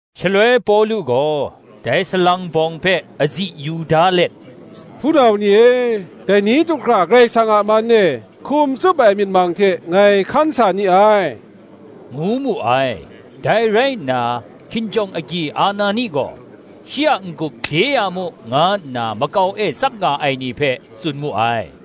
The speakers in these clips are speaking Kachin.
Shaloi Pawlu gaw dai salang bawng hpe azi yu da let, “Hpunau ni e, dai ni du hkra Karai Kasang a man e, hkum tsup ai myit mang hte ngai hkan sa ni ai,” ngu mu ai. Dai rai nna, hkinjawng agyi Anani gaw, “shi a n-gup bye ya mu,” nga nna makau e tsap nga ai ni hpe tsun mu ai.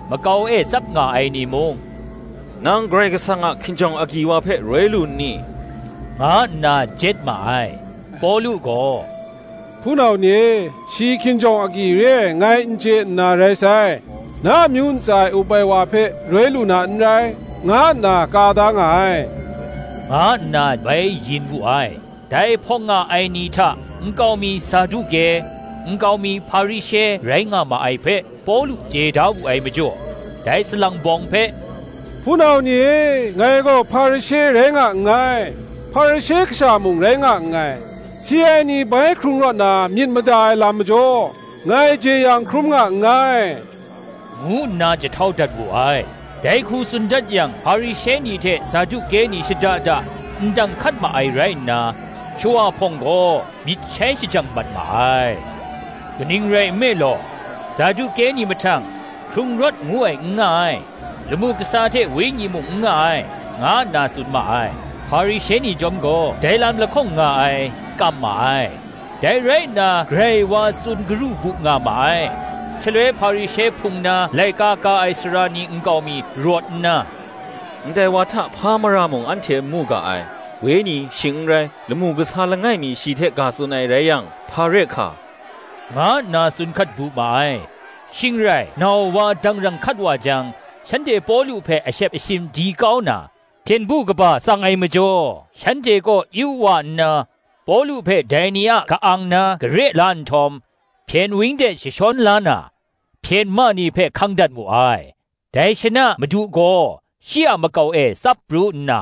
Makau e tsap nga ai ni mung, “Nang Karai Kasang a hkinjawng agyi wa hpe roi lu n ni?” nga nna jet ma ai. Pawlu gaw, “Hpunau ni e, shi hkinjawng agyi re ai ngai n chye nna rai sai; ‘na amyu ntsa e up ai wa hpe roi lu na n rai,’ nga nna ka da nga ai,” nga nna bai yin wu ai. Dai hpawng nga ai ni hta nkau mi Saduke, nkau mi Hparishe rai nga ma ai hpe Pawlu chye da wu ai majaw, dai salang bawng hpe, “Hpunau ni e, ngai gaw Hparishe rai nga nngai; Hparishe kasha mung rai nga nngai; si ai ni bai hkrung rawt na myit mada ai lam majaw, ngai jeyang hkrum nga nngai,” ngu nna jahtau dat wu ai. Dai hku tsun dat yang, Hparishe ni hte Saduke ni shada da ndang hkat ma ai rai nna, shawa hpawng gaw myit shai shajang mat ma ai. Kaning rai nme law, Saduke ni mahtang, ‘hkrung rawt ngu ai n nga ai, lamu kasa hte wenyi mung n nga ai,’ nga nna tsun ma ai; Hparishe ni chyawm gaw dai lam lahkawng nga ai, kam ma ai. Dai rai nna grai wa tsun garu bu nga ma ai; shaloi Hparishe hpung na laika ka ai sara ni nkau mi rawt nna, “Ndai wa hta hpa mara mung anhte n mu ga ai; Wenyi, shing n rai, lamu kasa langai mi shi hte ga tsun ai rai yang, hpa re hka, “--nga nna tsun hkat bu ma ai. Shing rai nau wa dangrang hkat wa jang, shanhte Pawlu hpe ashep ashin di kau na, hpyen du kaba tsang ai majaw, shanhte kaw yu wa nna, Pawlu hpe dai ni a ka-ang na kare la nhtawm, hpyen wang de jashawn la na, hpyen ma ni hpe hkang dat mu ai. Dai shana Madu gaw shi a makau e tsap pru nna,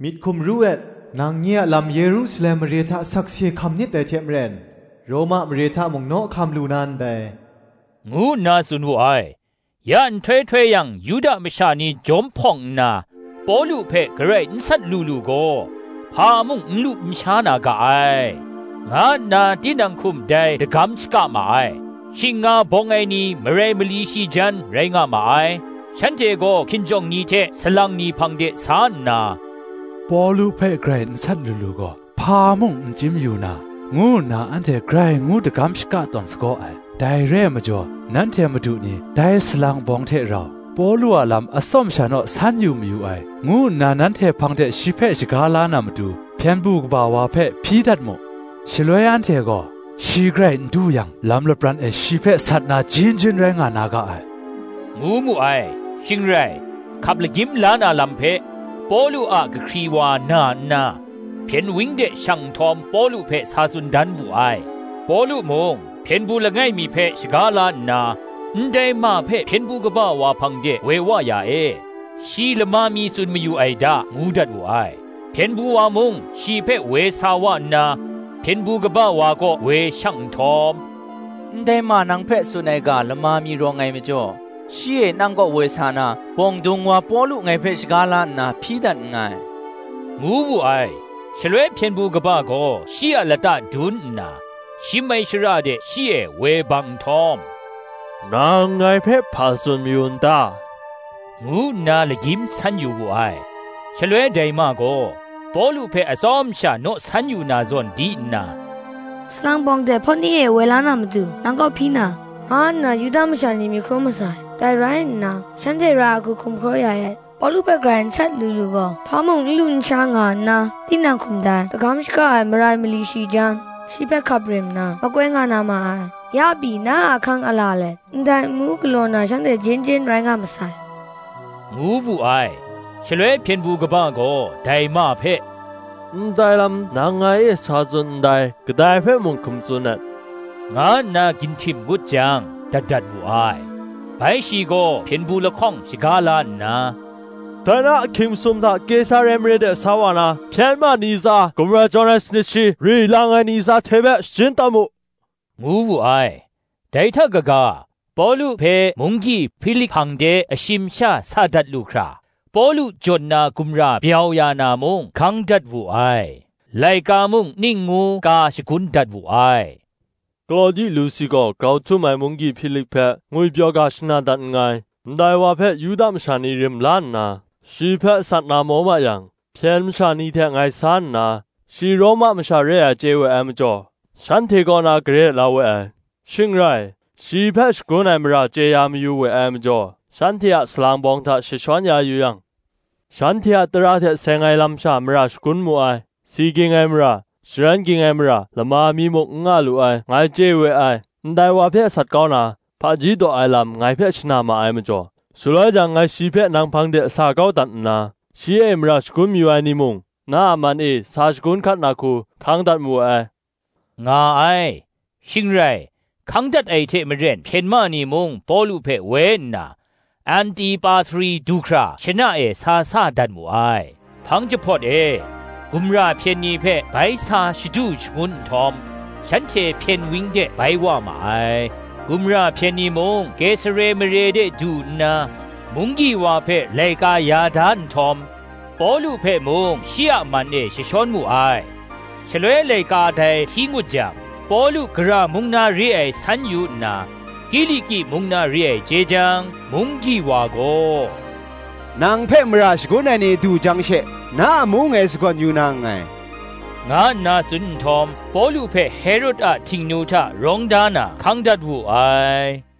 “Myit hkum ru et; nang nye a lam Yerusalem mare hta sakse hkam nit dai hte maren, Roma mare hta mung naw hkam lu na ndai,” ngu nna tsun wu ai. Ya nhtoi htoi yang Yuda masha ni jawm hpawng nna, “Pawlu hpe garai n sat lu lu gaw, hpa mung n lu n sha na ga ai,” nga nna tinang hkum dai dagam shaka ma ai. Shing nga bawng ai ni marai mali shi jan rai nga ma ai. Shanhte gaw hkinjawng ni hte salang ni hpang de sa nna, “Pawlu hpe garai n sat lu lu gaw, hpa mung n chyim yu na, ngu nna anhte grai ngu dagam shaka tawn sagaw ai. Dai re ai majaw, nanhte madu ni dai salang bawng hte rau, Pawlu a lam atsawm sha naw san yu mayu ai, ngu nna nanhte hpang de shi hpe shaga la na matu, hpyen du kaba wa hpe hpyi dat mu; shaloi anhte gaw, shi garai n du yang lam lapran e shi hpe sat na jin jin rai nga na ga ai,” ngu mu ai. Shing rai, hkap lagyim la na lam hpe, Pawlu a kahkri wa na nna, hpyen wang de shang nhtawm Pawlu hpe sa tsun dan wu ai. Pawlu mung, hpyen du langai mi hpe shaga la nna, “Ndai ma hpe hpyen du kaba wa hpang de woi wa ya e: shi lama mi tsun mayu ai da,” ngu dat wu ai. Hpyen du wa mung shi hpe woi sa wa nna, hpyen du kaba wa kaw woi shang nhtawm, “Ndai ma nang hpe tsun ai ga lama mi rawng ai majaw, shi e nang kaw woi sa na, bawng dung wa Pawlu ngai hpe shaga la nna hpyi dat nngai,” ngu wu ai. Shaloi hpyen du kaba gaw shi a lata dun nna, shim ai shara de shi e woi bang nhtawm, “Nang ngai hpe hpa tsun mayu n ta?” ngu nna lagyim san yu wu ai. Shaloi dai ma gaw, “Pawlu hpe atsawm sha naw san yu na zawn di nna, salang bawng de hpawt ni e woi la na matu, nang kaw hpyi na, nga nna Yuda masha ni myit hkrum masai. Dai rai nna shanhte ra ai hku hkum hkraw ya et; Pawlu hpe garai n sat lu lu gaw, hpa mung n lu n sha, nga nna tinang hkum dai dagam shaka ai marai mali shi jan, shi hpe hkap rim na makoi nga na ma ai; ya pyi, na a ahkang ala let, ndai amu galaw na shanhte jin jin rai nga masai,” ngu wu ai. Shaloi hpyen du kaba gaw, dai ma hpe, “Ndai lam nang ngai e sa tsun ndai, kadai hpe mung hkum tsun et,” nga nna ginhtim ngut jang dat dat wu ai. Bai shi gaw, hpyen du lahkawng shaga la nna, “Dai na ahkying masum hta Kesare mare de sa wa na, hpyen ma ni tsa, gumra jawn ai sanit shi, ri lang ai ni tsa hte hpe shajin tawn mu,” ngu wu ai: dai hta kaga, Pawlu hpe munggyi Hpilik hpang de ashim sha sa dat lu hkra, Pawlu jawn na gumra byau ya na mung hkang dat wu ai. Laika mung ning ngu ka shagun dat wu ai: “Klawdi Lusi gaw, grau htum ai munggyi Hpilik hpe ngwipyaw ga shana dat nngai. Ndai wa hpe Yuda masha ni rim la nna, shi hpe sat na maw ma yang, hpyen masha ni hte ngai sa nna, shi Roma masha re ai chye we ai majaw, shanhte kaw na kare la we ai. Shing rai, shi hpe shagun ai mara chye ya mayu we ai majaw, shanhte a salang bawng hta jashawn ya yu yang, shanhte a tara hte seng ai lam sha mara shagun mu ai; si ging ai mara, sharen ging ai mara lama mi muk n nga lu ai, ngai chye we ai. Ndai wa hpe sat kau na, hpaji daw ai lam ngai hpe shana ma ai majaw, shaloi jang ngai shi hpe nang hpang de sa kau dat nna, shi e mara shagun mayu ai ni mung, na a man e sa shagun hkat na hku, hkang dat mawe ai,” nga ai. Shing rai, hkang dat ai hte maren hpyen ma ni mung Pawlu hpe woi nna, Antipatri du hkra shana e sa sa dat mu ai. Hpang jahpawt e, gumra hpyen ni hpe bai sa shadu shangun nhtawm, shanhte hpyen wang de bai wa ma ai: gumra hpyen ni mung Kesare mare de du nna, munggyi wa hpe laika ya da nhtawm, Pawlu hpe mung shi a man e jashawn mu ai. Shaloi laika dai hti ngut jang, Pawlu gara mung na re ai san yu nna, Kiliki mung na re ai chye jang, Munggyi wa gaw, “Nang hpe mara shagun ai ni du jang she, na amu ngai sagawn yu na nngai,” nga nna tsun nhtawm, Pawlu hpe Herod a htingnu hta rawng da na, hkang dat wu ai.